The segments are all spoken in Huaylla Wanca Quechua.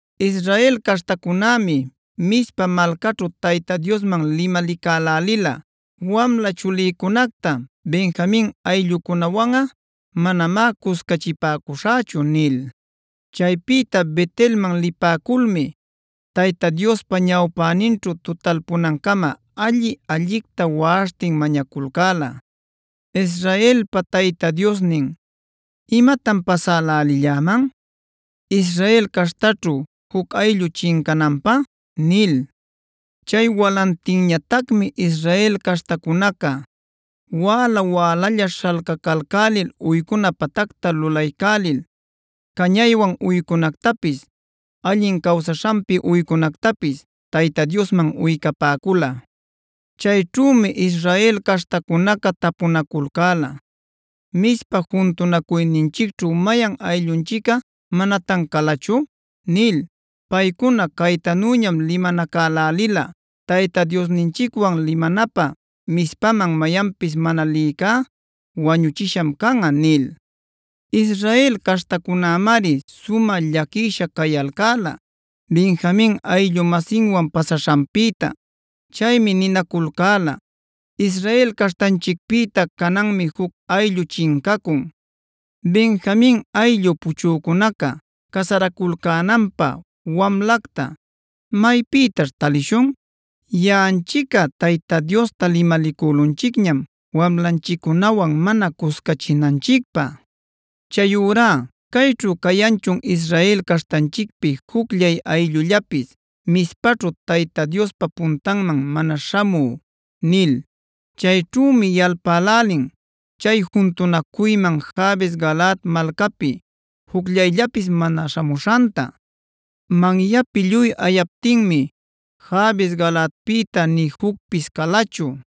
Israel caśhtacunämi Mizpa malcaćhu Tayta Diosman limalicälälila: “Wamla chulïcunacta Benjamin ayllucunäwanꞌa manamá cuscachipäcuśhächu” nil. Chaypïta Bet-elman lipäculmi Tayta Diospa ñawpäninćhu tutalpunancama alli-allicta waꞌaśhtin mañaculcäla: “Israelpa Tayta Diosnin, ¿imatan pasälälilläman, Israel caśhtaćhu juc ayllu chincananpä?” nil. Chay walantinñatacmi Israel caśhtacunaca wäla-wälalla śhalcacalcälil uycuna patacta lulaycälil cañaywan uycunactapis, allin cawsaśhanpi uycunactapis Tayta Diosman uycapäcula. Chayćhümi Israel caśhtacunaca tapunaculcäla: “¿Mizpa juntunacuyninchicćhu mayan ayllullanchicꞌa manatan calachu?” nil. Paycuna caytanüñam limanacälälila: “Tayta Diosninchicwan limanapä Mizpaman mayanpis mana lïcá ‘wañuchisham canꞌa’” nil. Israel caśhtacunämari sumä llaquisha cayalcäla Benjamin ayllu-masinwan pasaśhanpïta. Chaymi ninaculcäla: “Israel caśhtanchicpïta cananmi juc ayllu chincacun. Benjamin ayllu puchücunaca casaraculcänanpä wamlacta, ¿maypïtaćh talishun? Yaꞌanchicꞌa Tayta Diosta limalicülunchicñam wamlanchiccunawan mana cuscachinanchicpä. Chayurá ¿cayćhu cayanchun Israel caśhtanchicpi jucllay ayllullapis, Mizpaćhu Tayta Diospa puntanman mana śhamü?” nil. Chayćhümi yalpälälin chay juntunacuyman Jabes-galaad malcapi jucllayllapis mana śhamuśhanta. Manyapi lluy ayaptinmi Jabes-galaadpïta nï jucpis calachu.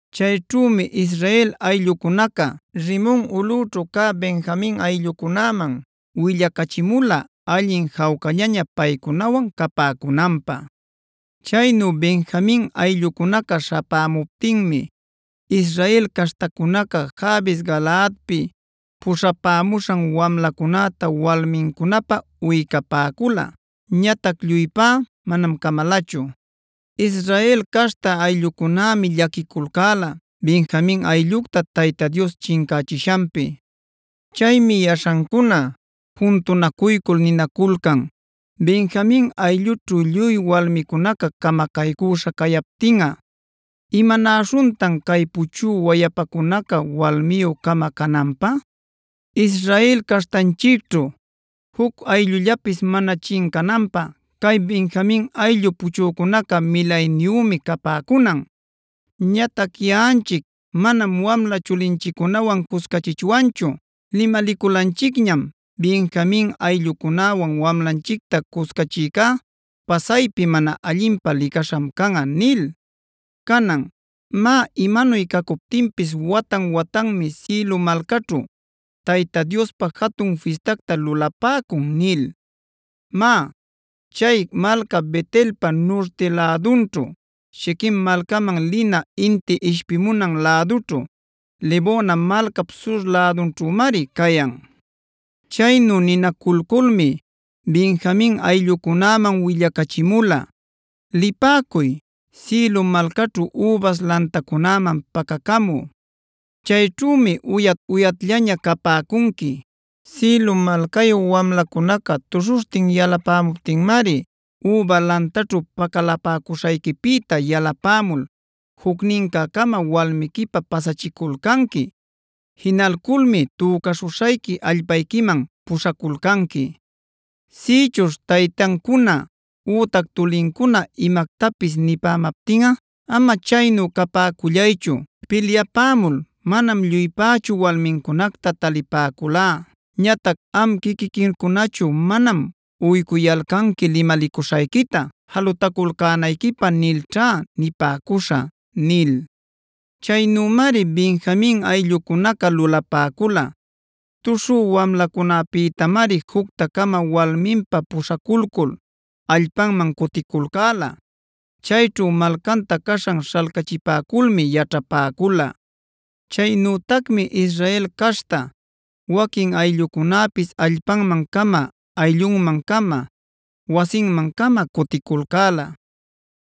Chayćhümi Israel ayllucunaca Rimon ulꞌućhu cä Benjamin ayllucunäman willacachimula allin jawcallaña paycunawan capäcunanpä. Chaynu Benjamin ayllucunaca śhapämuptinmi Israel caśhtacunaca Jabes-galaadpi puśhapämuśhan wamlacunäta walmincunäpä uycapäcula. Ñatac lluypá manam camalachu. Israel caśhta ayllucunämi llaquiculcäla Benjamin ayllucta Tayta Dios chincächishanpi. Chaymi yaśhancuna juntunacuycul ninaculcan: “Benjamin ayllućhu lluy walmicunaca camacaycüśha cayaptinꞌa, ¿imanaśhuntan cay puchü wayapacunaca walmiyü-cama cananpä? Israel caśhtanchicćhu juc ayllullapis mana chincananpä cay Benjamin ayllu puchücunaca milayniyümi capäcunan. Ñatac yaꞌanchic manam wamla chulinchiccunawan cuscachichwanchu; limaliculanchicñam: ‘Benjamin ayllucunäwan wamlanchicta cuscachïcá pasaypi mana allinpä licaśham canꞌa’ nil. Canan, má imanuy cacuptinpis watan-watanmi Siloa malcaćhu Tayta Diospä jatun fistacta lulapäcun” nil. (Má, chay malca Bet-elpa nurti lädunćhu, Shiquem malcaman lina inti ishpimunan lädućhu, Lebona malcap sur lädunćhümari cayan). Chaynu ninaculculmi Benjamin ayllucunäman willachimula: “Lipäcuy, Silo malcaćhu übas lantacunäman pacacamü. Chayćhümi uyat-uyatllaña capäcunqui. Silo malcayu wamlacunaca tuśhuśhtin yalapämuptinmari üba lantaćhu pacalapäcuśhayquipïta yalapämul jucnincä-cama walmiquipä pasachiculcanqui. Jinalculmi tücaśhuśhayqui allpayquiman puśhaculcanqui. Sïchuśh taytancuna ütac tulincuna imactapis nipämaptinꞌa: ‘Ama chaynu capäcullaychu, pilyapämul manam lluypächu walmincunacta talipäculá. Ñatac am quiquiquicunachu manam uycuyalcanqui limalicuśhayquita jalutaculcänayquipä’ nilćha nipäcuśhä” nil. Chaynümari Benjamin ayllucunaca lulapäcula. Tuśhü wamlacunäpïtamari jucta-cama walminpä puśhaculcul allpanman cuticulcäla. Chayćhu malcanta caśhan śhalcachipäculmi yaćhapäcula. Chaynütacmi Israel caśhta waquin ayllucunäpis allpanman-cama, ayllunman-cama, wasinman-cama cuticulcäla.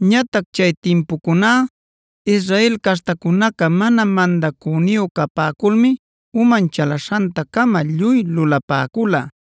Ñatac chay timpucuná Israel caśhtacunaca mana mandacüniyu capäculmi uman chalaśhanta-cama lluy lulapäcula.b